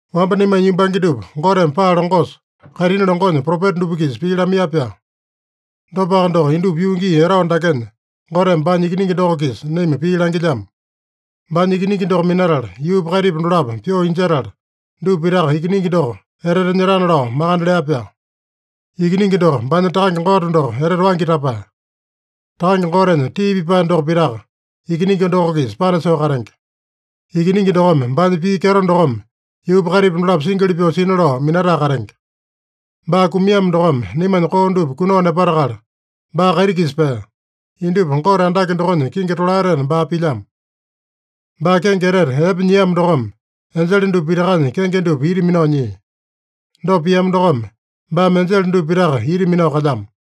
Wamba naimanya yumbange dupa Goteme paa longosa, kaitini longonya propeta dupa-kisa pii lamaiya-pyaa. Dopaka doko, indupa yuu gii etao dakenya Goteme baanya Ikiningi doko-kisa naima pii langilyamo. Baanya Ikiningi doko minatala yuupa kaitipa dolapo pyoo injetala, dupa pitaka Ikiningi doko etete nyetana lao makande lea-pyaa. Ikiningi doko baanya Takange Gote doko etete waingi tapae. Takange Gotenya tii pipae doko pitaka Ikiningi doko-kisa panasoo katenge. Ikiningi dokome baanya pii kyeto dokome yuupa kaitipa dolapo singili pyoo sina lao minatae katenge. Baa kumiamo dokome naimanya koo dupa kunao nepatakala, baa kaiti-kisa pea. Indupa Gote andake dokonya kingi tolaetena baa pilyamo. Baa kenge etete epe nyiamo dokome, enjele dupa pitakanya kenge dupa ita minao nyia. Dopa piamo dokome, baame enjele dupa pitaka ita minao kalyamo.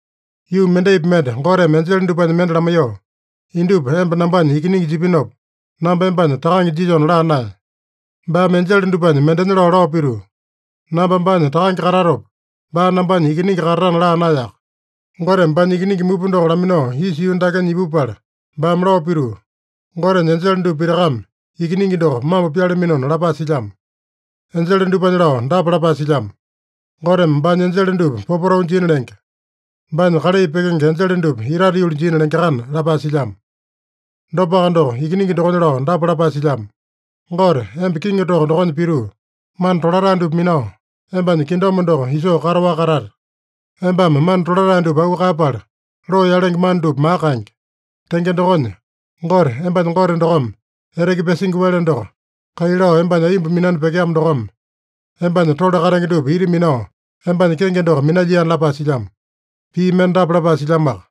Yuu mendaipi mende Goteme enjele dupanya mende lamaiyoo, “Indupa emba nambanya Ikiningi jipinopa, namba embanya Takange jilyona” laa naeya. Baame enjele dupanya mendenya lao, lao pituu, “Namba baanya Takange katatopa, baa nambanya Ikiningi katatana” laa naeyaka. Goteme baanya Ikiningi mupa doko laminao isa yuu dakenya ipupala, baame lao pituu, “Gotenya enjele dupa pitakame Ikiningi doko mambo pyalaminona” lapae silyamo. Enjele dupanya lao dapa lapae silyamo: “Goteme baanya enjele dupa popotau jina lenge. Baanya kalai pyekenge enjele dupa itate yuli jina lengeakana” lapae silyamo. Dopaka doko, Ikiningi dokonya lao dapa lapae silyamo: “Gote, emba kiŋi toko dokonya pituu, mana tolatae dupa minao, embanya kingdom doko isoo kataowaka katate. Embame mana tolatae dupa auu kaeyapala, loo yalenge mana dupa maka kaenge. Tenge dokonya, Gote, embanya Gote dokome eteke pyasingi wele doko kai lao embanya aiyomba minani pyekeamo dokome, embanya tole katenge dupa ita minao embanya kenge doko minalyiana” lapae silyamo. Pii mende dapa lapae silyamoaka: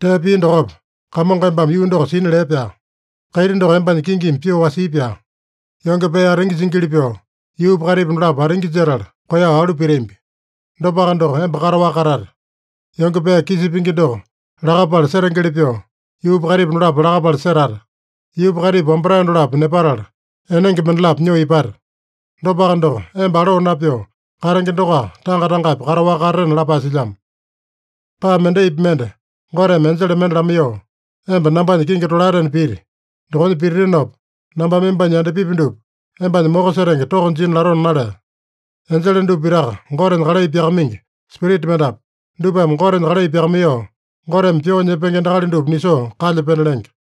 “Tee pia dokopa, Kamongo embame yuu doko sina lee-pyaa. Kaiti doko embanya kingimi pyoo wasii-pyaa. Yonge pee atingi jingili pyoo, yuupa kaitipa dolapo atingi jetala, koeyao alu pitambi. Dopaka doko, emba kataowaka katate. Yonge pee kisa pingi doko lakapala setengeli pyoo, yuupa kaitipa dolapo lakapala setate. Yuupa kaitipa wambatae dolapo nepatala, enenge mendalapo nyoo ipate. Dopaka doko, emba aloo napyoo katenge dokoaka, tanga-tangapi kataowaka katatena” lapae silyamo. Paa mendaipi mende Goteme enjele mende lamaiyoo, “Emba nambanya kingi tolaetena piti. Dokonya pititinopa, nambame embanya yandapipi dupa embanya moko setenge toko jina latona” nalea. Enjele dupa pitaka Gotenya kalai pyakamaingi spirita mendapu. Dupame Gotenya kalai pyakamaiyoo, Goteme pyoo nyepenge endakali dupa nisoo kalya pena lenge.